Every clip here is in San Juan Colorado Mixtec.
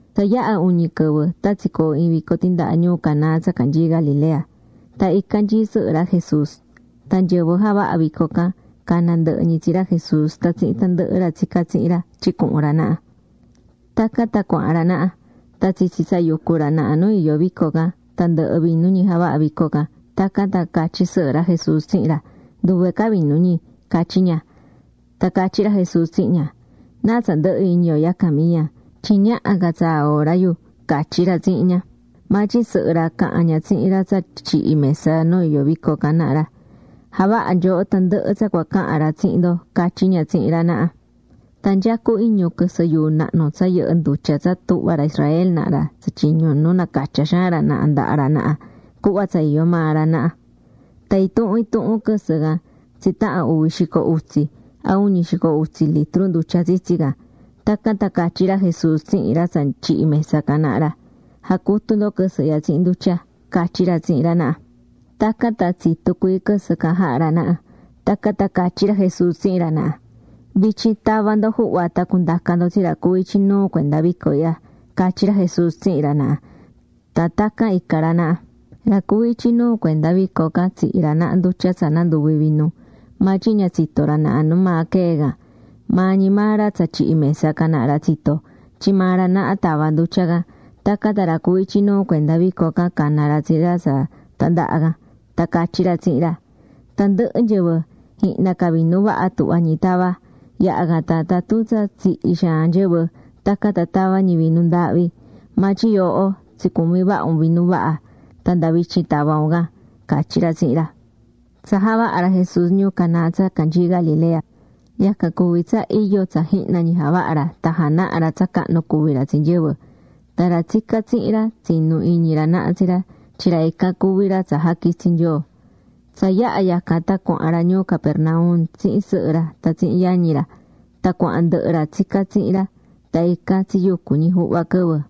Tsa yaha̱ uñi quɨvɨ tan tsicoo̱ iin vico tindaha ñuu Caná tsa canyií Galilea. Tan ican nyií sɨhɨ ra Jesús. Tan nyɨvɨ javaha̱ vico can cana̱ ndɨhɨ ñi tsi ra Jesús tan tsihin tandɨhɨ ra tsicá tsihin ra tyin cuhun ra naha. Tacan tan cuahán ra naha. Tan tsitsi tsa yucú ra naha nu iyó vico can, tan ndɨhɨ̱ vinu ñi javaha̱ vico can. Tacan tan catyí sɨhɨ ra Jesús tsihin ra: ―Nduve ca vinu ñi ―catyí ña. Tan catyí ra Jesús tsihin ña: ―¿Náa tsa ndɨhɨ iñi yo yacan, Miyan? Tyin ñaha ca tsaa hora yu ―catyí ra tsihin ña. Maa tyin sɨhɨ ra caha̱n ña tsihin ra tsa tyihí mesa nu iyó vico can naha ra: ―Ja̱vaha nyooho tandɨhɨ tsa cua cahan ra tsihin ndo ―catyí ña tsihin ra naha. Tan nyecú iñu quɨsɨ yuu nahnu tsa yɨhɨ́ ndutya tsa tuhvá ra Israel naha ra tsatyiñú nu nacatyá xaan ra naha ndaha ra naha cuhva tsa iyó maa ra naha. Tan intuhun intuhun quɨsɨ can tsitahan uvi xico utsi, a uñi xico utsi, litru ndutya tsitsi can. Tacan tan catyí ra Jesús tsihin ra tsa tyihí mesa can naha ra: ―Ja̱cutu ndo quɨsɨ ihya tsihin ndutya ―catyí ra tsihin ra naha. Tacan tan tsitu̱ cuii quɨsɨ can jaha̱ ra naha. Tacan tan catyí ra Jesús tsihin ra naha: ―Vityin ta̱va ndo juhva tan cu̱ndaca ndo tsi ra cuví ityi nuu cuenda vico ihya ―catyí ra Jesús tsihin ra naha. Tan tacan ica̱ ra naha. Ra cuví ityi nuu cuenda vico can tsihi̱ ra naha ndutya tsa nanduvi̱ vinu. Maa tyin ña tsitó ra naha nu maa quee̱ can. Maa ñi maa ra tsa tyihí mesa can naha ra tsitó, tyin maa ra naha tava̱ ndutya can. Tacan tan ra cuví ityi nuu cuenda vico can cana̱ ra tsi ra tsa tandaha can. Tan catyí ra tsihin ra: ―Tandɨhɨ nyɨvɨ, jihna ca vinu vaha tuhvá ñi tava. Yaha can tan tatun tsa tsihi̱ xaan nyɨvɨ, tacan tan tava ñi vinu ndaahvi. Maa tyin yooho tsicumi̱ vaha un vinu vaha. Tan nda vityin tava̱ un can ―catyí ra tsihin ra. Tsa javaha̱ ra Jesús ñuu Caná tsa canyii Galilea, yacan cuví tsa iyo tsa jihna ñi javaha̱ ra tan janaha̱ ra tsa cahnu cuví ra tsi nyɨvɨ. Tan ra tsicá tsihin ra tsinu̱ iñi ra naha tsi ra tyin ra ican cuví ra tsa jaquitsi̱ Nyoo. Tsa yaha̱ yacan tan cuahán ra ñuu Capernaum tsihin sɨhɨ ra tan tsihin yañi ra. Tan cuahan ndɨhɨ ra tsicá tsihin ra. Tan ican tsiyucu̱ ñi juhva quɨvɨ.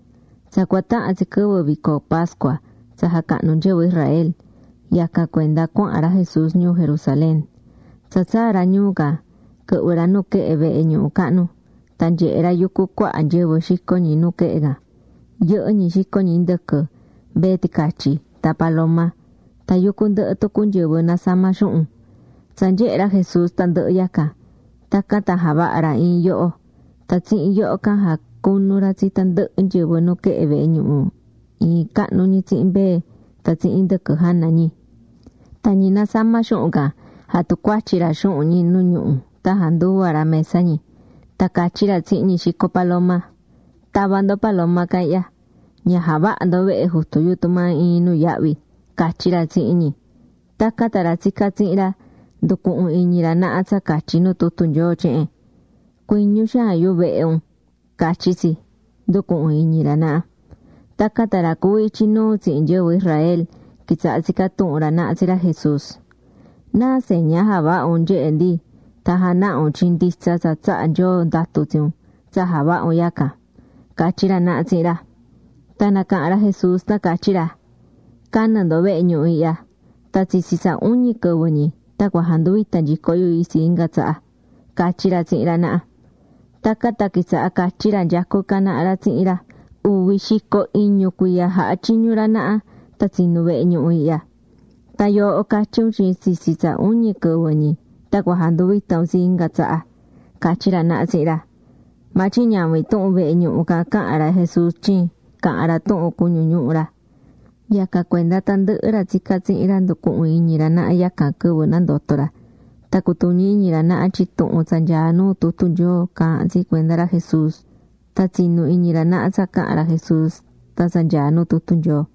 Tsa cua tahan tsi quɨvɨ vico pascua tsa jacahnú nyɨvɨ Israel. Yacan cuenda cuahán ra Jesús ñuu Jerusalén. Tsa tsaa̱ ra ñuu can, quɨhvɨ̱ ra nuquehe vehe ñuhu cahnu, tan nyehe̱ ra yucú cuaha nyɨvɨ xicó ñi nuquehe can. Yɨhɨ́ ñi xicó ñi indɨquɨ, mbee ticatyi, tan paloma. Tan yucú ndɨhɨ tucu nyɨvɨ nasamá xuhun. Tsa nyehe̱ ra Jesús tandɨhɨ yacan, tacan tan javaha̱ ra iin yoho. Tan tsihin yoho can jacunu̱ ra tsi tandɨhɨ nyɨvɨ nuquehe vehe ñuhu iin cahnu ñi tsihin mbee tan tsihin indɨquɨ jana ñi. Tan ñi nasamá xuhun can, jatucuatyi̱ ra xuhun ñi nu ñuhu tan janduva̱ ra mesa ñi. Tan catyí ra tsihin ñi xicó paloma: ―¡Ta̱va ndo paloma can ihya! ¡Ña ja̱vaha ndo vehe Jutu yu tumaa iin nuyahvi! ―catyí ra tsihin ñi. Tacan tan ra tsicá tsihin ra, nducuhu̱n iñi ra naha tsa catyí nu tutu Nyoo tyehen: “Cuiñu xaan yu vehe un”, catyí tsi, nducuhu̱n iñi ra naha. Tacan tan ra cuví ityi nuu tsihin nyɨvɨ Israel quitsaha̱ tsicá tuhun ra naha tsi ra Jesús: ―¿Náa seña javaha un nyehe ndi tan janaha un tyin nditsa tsa tsaha̱ Nyoo ndatu tsi un tsa javaha un yacan? ―catyí ra naha tsihin ra. Tan nacaha̱n ra Jesús tan catyí ra: ―Ca̱nɨ ndo vehe ñuhu ihya, tan tsitsi tsa uñi quɨvɨ ñi tan cua janduvita nyico yu itsi inga tsaha ―catyí ra tsihin ra naha. Tacan tan quitsaha̱ catyí ra nyecú ican naha ra tsihin ra: ―Uvi xico iñu cuiya jaha̱ tyiñu ra naha tan tsinu̱ vehe ñuhu ihya. ¡Tan yooho catyí un tyin tsitsi tsa uñi quɨvɨ ñi tan cua janduvita un itsi inga tsaha! ―catyí ra naha tsihin ra. Maa tyin ñavin tuhun vehe ñuhu can caha̱n ra Jesús, tyin caha̱n ra tuhun cuñu ñuhu ra. Yacan cuenda tandɨhɨ ra tsicá tsihin ra nducuhu̱n iñi ra naha yacan quɨvɨ nandoto̱ ra. Tan cutuñi̱ iñi ra naha tyin tuhun tsa nyaá nuu tutu Nyoo caahán tsi cuenda ra Jesús. Tan tsinu̱ iñi ra naha tsa caha̱n ra Jesús tan tsa nyaá nu tutu Nyoo.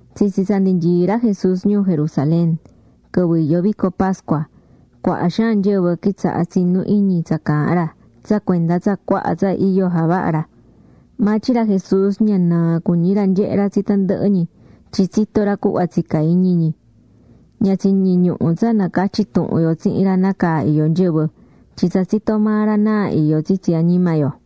Tsitsi tsa ndi nyií ra Jesús ñuu Jerusalén, quɨvɨ iyó vico pascua, cuaha xaan nyɨvɨ quitsaha̱ tsinú iñi tsa caahán ra tsa cuenda tsa cuaha tsa iyo javaha̱ ra. Maa tyin ra Jesús ña nɨɨ cuñí ra nyehé ra tsi tandɨhɨ ñi tyin tsitó ra cuhva tsicá iñi ñi. Ña tsiñiñuhu̱ tsa nacatyi tuhun yo tsihin ra nácaa iyó nyɨvɨ, tyin tsa tsitó maa ra náa iyó tsitsi añima yo.